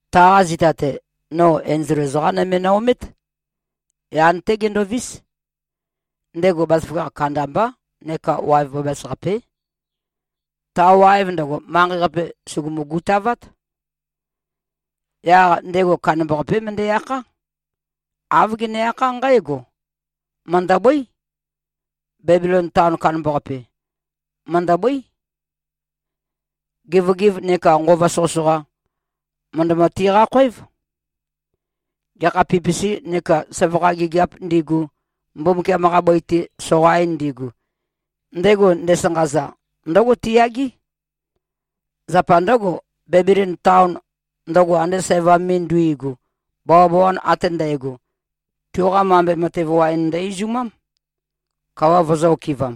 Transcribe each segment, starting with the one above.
Taqa zita-te, no enzol ezoqa nøme no-omét. Yan-té gendovís. Ndego bazaføgakh kandambá neka waev bæbæs-qapé. Ta waev ndøgo, manqei-qape, sùgumu-gutavát. Yaq ndego kandambaqapé møndæ-akhá. Āv gene-akhá nqǽgo, “Mø̀ndøbøí. Bebilon taon kandambaqape, mø̀ndøbøí. Gevøgev nekā nqova soqøsoqa, mø̀ndømø-tiqá-khóev. Gekha pipisi neka søvakha gigiāp ndigu, Mbumbukiam-qa bøi-te soqain ndigu, ndego ndesanqaza, ndǿgo tiyagé. Zapa ndǿgo, Bebilon taon, ndøgo ande sævam me nduigu, bawabawan ate ndægo, tuqa mambe matev waen ndø-izumám, kawa vøzø̄-okɨvam.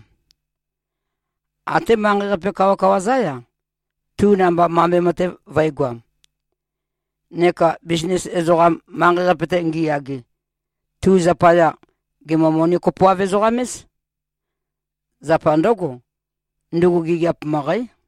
Até manqei-qape kawakawa-zá-ya, tu namba mambe matev vø̄egoam. Neka bisnis ezoqam, manqei-qape-te ngiyage, tu zapaya, gèmø-moni-kopoav-ezoqam-éz. Zapa ndǿgo, ndugu gigiap møqǽ.”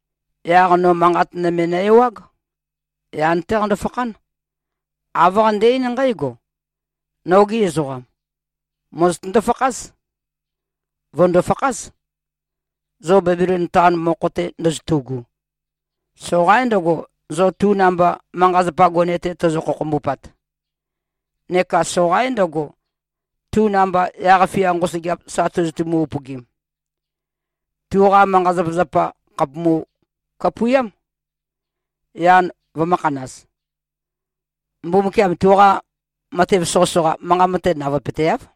Yaq no manqat nøme nø-ewág. Yan-té qando-fakhán. Āv qande-eín nqǽgo, “Nogi ezoqam! Mòzotøndo-fakház. Vø̀ndo-fakház, zo Bebilon taon mokho-te ndozotu꞉gu. Soqaín ndøgo, zo tu namba manqa-zapa gone-te tozo-khokhombupat. Neka soqaín ndøgo, tu namba yaq-fia nqosøgeap sa tozotumu-upøgim. Tuqa manqa-zapazapa, khàpumu-kapuiám, yan vømø̄khanaz. Mbumbukiam tuqa matev soqøsoqa, manqa mate navøepøteáv.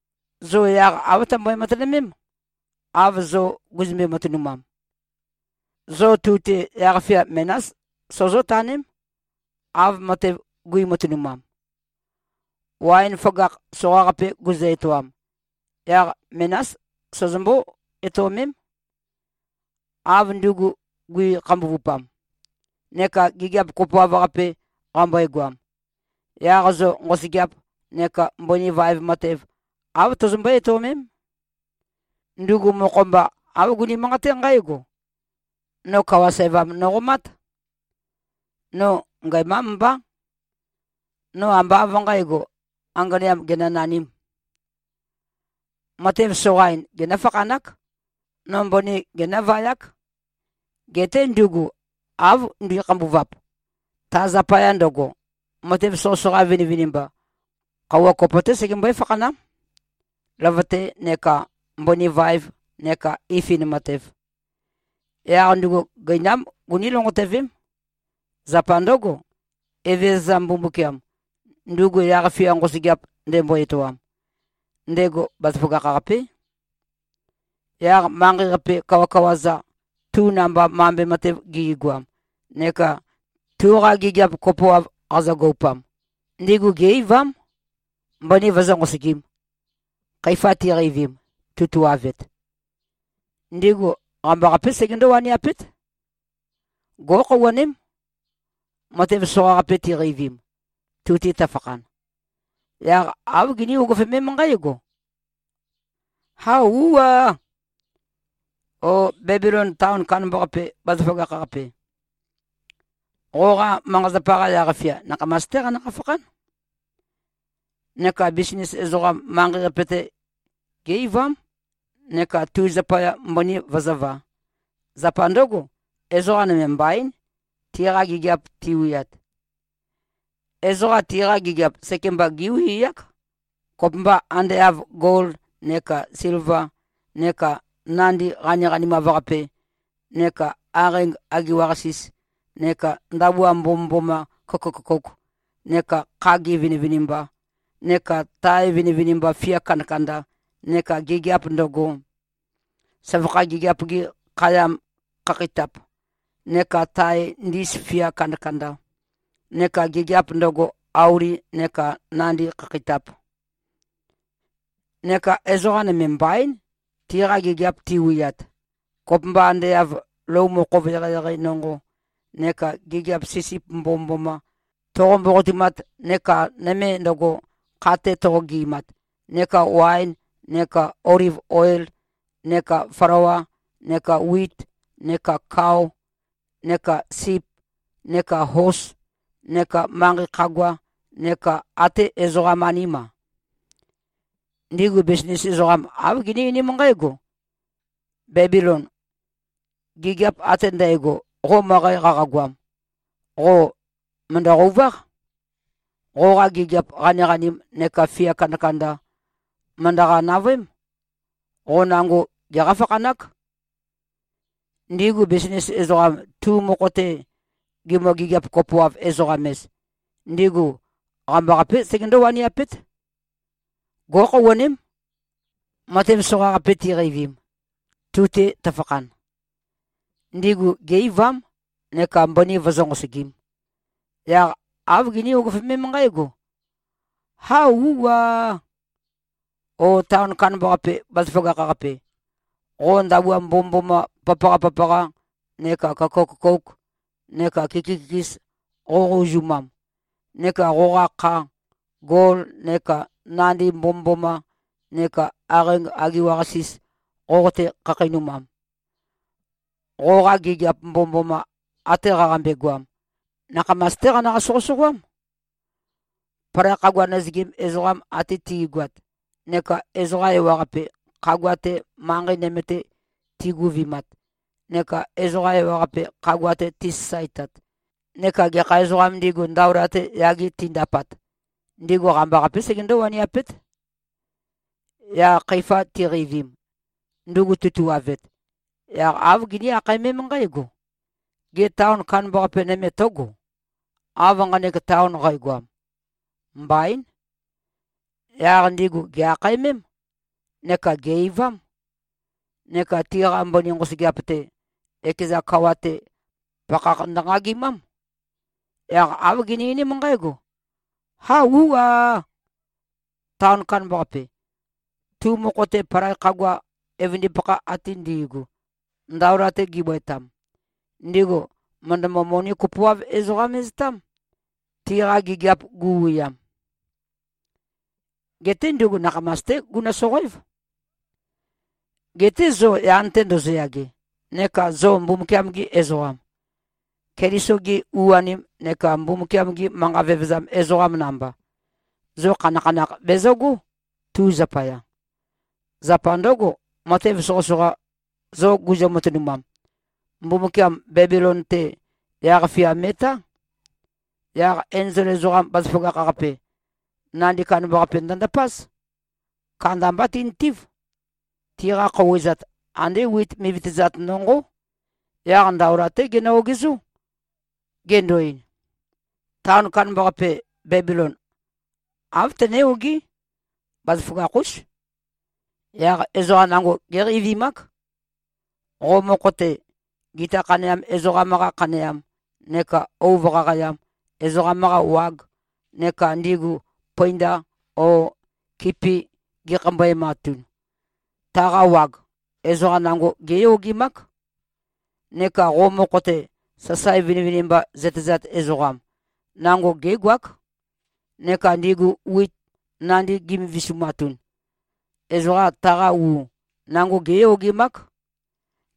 Zo yaq āv tømbøe-matønømém, av zo guzømbe-matønumam. Zo tu-te yaq-fia menás sozó-taném, av matev guimatønumam. Waen føgakh soqaqape guzø-etoam, yaq menás sozombó-etøomém. Av ndugu gui-khambuvupam neka gigiap kopoav-qape qambøegoam, yaq zo nqosøgeap neka mbøni vaev matev, āv tozombøé-etøomém. Ndugu mokho-mba, āv guni-manqaté nqǽgo, ‘No kawa sævam noqomát. No ngæmám mbá. No ambá av nqǣgo, anganeam genønanīm. Matev soqain genǿ-fakhanák. No mbøni genǿvayák.’ Geté ndugu av nduikhambuvap, ta zapaya ndøgo, matev soqøsoqa vinivinimba, khøuwa kopo-té segembøé-fakhanám, løvøte neka mbøni vaev neka ifin matev. Yaq ndugu gøinám guní-lonqotøvém. Zapa ndǿgo, Evezøza Mbumbukiam, ndugu yaq-fia nqosøgeap ndembo-etoam, ndego bazaføgakh-qapé.” Yaq manqei-qape kawakawa-za, tu namba mambe matev gi꞉goam neka tuqa gigiap kopoav qazøgoupam, ndigu gé-eivám, mbøni vøzǿ-nqosøgīm, khøifa tiqeivim, tutuavet. Ndigu qambaqapé segendó-waniapét. Gó꞉khouwaném, matev soqaqape tiqeivim, tu-te tøfakhan. Yaq āv giní-ugufømém nqǽgo, “Hao, ú꞉-ā꞉! O Bebilon taon kandambaqape, bazaføgakh-qape. Qoqa manqa-zapa-qa yaq-fia, nakhamas-té qanøqa-fakhán.” Neka bisnis ezoqam, manqei-qape-te, gé-eivám neka tu zapaya mbøni vøzǿvā. Zapa ndǿgo, ezoqa nøme mbaín, tiqa gigiap tiwiat. Ezoqa tiqa gigiap sekemba géwiák, kopømba ande av gol neka silva neka nandi qaniqanimav-qape neka aqeing agiwa-qasis, neka ndabua mbomømboma køkø-køkouk neka khagi vinivinimba, neka tae vinivinimba fia kandakanda, neka gigiap ndøgo, søvakha gigiap-gi khayam khakheitap, neka tae ndis fia kandakanda, neka gigiap ndøgo, auli neka nandi khakheitap. Neka ezoqa nøme mbaín, tiqa gigiap tiwiat, kopømba ande av lou mokhov eqeieqei nonqo, neka gigiap sisip mbomømboma, toqo-mboqotumat, neka nøme ndøgo, kha-te toqo-gɨ꞉mat, neka waen neka oliv oil, neka flawa, neka wit, neka kao, neka sip, neka hos, neka manqei khagua, neka até ezoqam-aním-a. Ndigu bisnis ezoqam, āv giní-einím nqǽgo, “Bébilon. Gigiap ate ndægo, qo møqæ qaqagoam, qo mø̀ndø-qøuváq. Qoqa gigiap qaniqanim neka fia kandakanda mø̀ndøqa-navøém. Qo nango geqá-fakhanák.” Ndigu bisnis ezoqam, tu mokho-te gimø-gigiap-kopoav-ezoqam-ez, ndigu qambaqapé segendó-waniapét. Gó꞉khouwaném, matev soqaqape tiqeivim, tu-te tøfakhan. Ndigu gé-eivám neka mbøni vøzǿ-nqosogīm. Yaq āv giní-ugufømém nqǽgo, “Hao, ú꞉-ā꞉! O taon kandambaqape, bazaføgakh-qape, qo ndabua mbomømboma papaqa-papaqa neka køkø-køkouk neka kiki-kikis qoqo-uzumam neka qoqa kha, gol neka nandi mbomømboma neka aqeing agiwa-qasis voqotē-khakheinumam, qoqa gigiap mbomømboma, ate qaqambe-goam, nakhamas-té qanøqa-soqøsoqøám.” Palai khagua nøzøgim ezoqam ate ti꞉goat neka ezoqa ewaqape, khagua-te, manqei nøme-te tiguvimat, neka ezoqa ewaqape, khagua-te tisasaetat neka gekha ezoqām ndigu, ndaola-te yage tindapat, ndigu qambaqapé segendó-waniapét. Yaq khøifa tiqeivim, ndugu tutuavet, yaq āv giní-akhaemém nqǽgo, “Gê, taon kandambaqape nøme tǿgo, av nqanek taon qægoam? Mbaín.” Yaq ndigu gè-akhaemém, neka gè-eivám. Neka tiqa mbøni nqosøgeap-te, ekeza kawa-te, pakhakh ndønqagimám. Yaq āv gini-einím nqǽgo, “Hao, ú꞉-ā꞉! Taon kandambaqape. Tu mokho-te, palai khagua evøndipakha ate ndi꞉gu, ndaola-te gibøetam, ndigu mø̀ndømø-moni-kopoav-ezoqam-eztám, tiqa gigiap guwiam. Geté ndugu nakhamas-té gunø-soqoév.” “Geté zo yan-te ndozoyage, neka zo Mbumbukiam-gi ezoqam, Keliso-gi u-anim neka Mbumbukiam-gi manqa vevezam ezoqam namba, zo khanakhanakh bezøgó, tu zapaya. Zapa ndǿgo, matev soqøsoqa, zo guzø-matønumam, Mbumbukiam Bebilon-te, yaq-fia me꞉tá.” Yaq enzol ezoqam bazaføgakh-qape, nandi kandambaqape ndøndapáz. Kandambá tintív. Tiqa khouwezat, andé wit mivitøzat nonqó. Yaq ndaola-té genø-ogezó, gendo-ein, “Taon kandambaqape, Bebilon, āv tøné-ogí. Bazaføgakh-ús. Yaq ezoqa nango géqeivimák. Qo mokho-te, gita khaneam ezoqam-qa khaneam neka ouv qaqayam ezoqam-qa wag neka ndigu pøinda o kipi gikhambøematun, taqa wag, ezoqa nango géyogemák. Neka qo mokho-te, sasae vinivinimba zøtezat ezoqam, nango gégoák. Neka ndigu wit nandi gi꞉mivisumatun, ezoqa taqa u, nango géyogemák.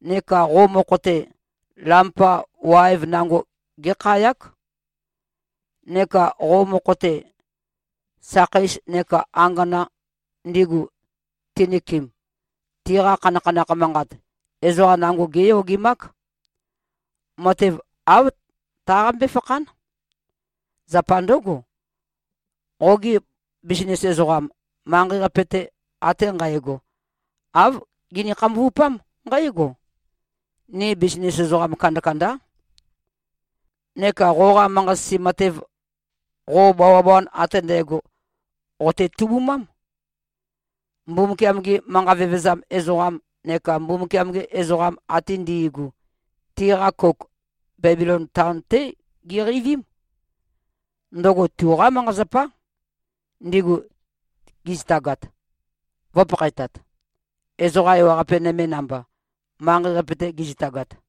Neka qo mokho-te, lampa waev nango gékhayák. Neka qo mokho-te, sakheis neka angana, ndigu tinøkem, tiqa khanakhanakh manqat, ezoqa nango géyogemák. Matev āv taqambé-fakhán. Zapa ndǿgo, qogi bisnis ezoqam, manqei-qape-te ate nqægo, āv gini-khambuvupám nqǽgo, ‘Ni bisnis ezoqam kandakandá.’ Neka qoqa manqa-sisi matev, qo bawabawan ate ndægo qote-tubumám. Mbumbukiam-gi manqa vevezam ezoqam neka Mbumbukiam-gi ezoqam ate ndi꞉gu, tiqa kouk, Bebilon taon-té giqeivím. Ndøgo tuqá manqa-zapá, ndigu gizitagat, vø̄pakhaetat, ezoqa ewaqape nøme namba, manqei-qape-te gizitagat.”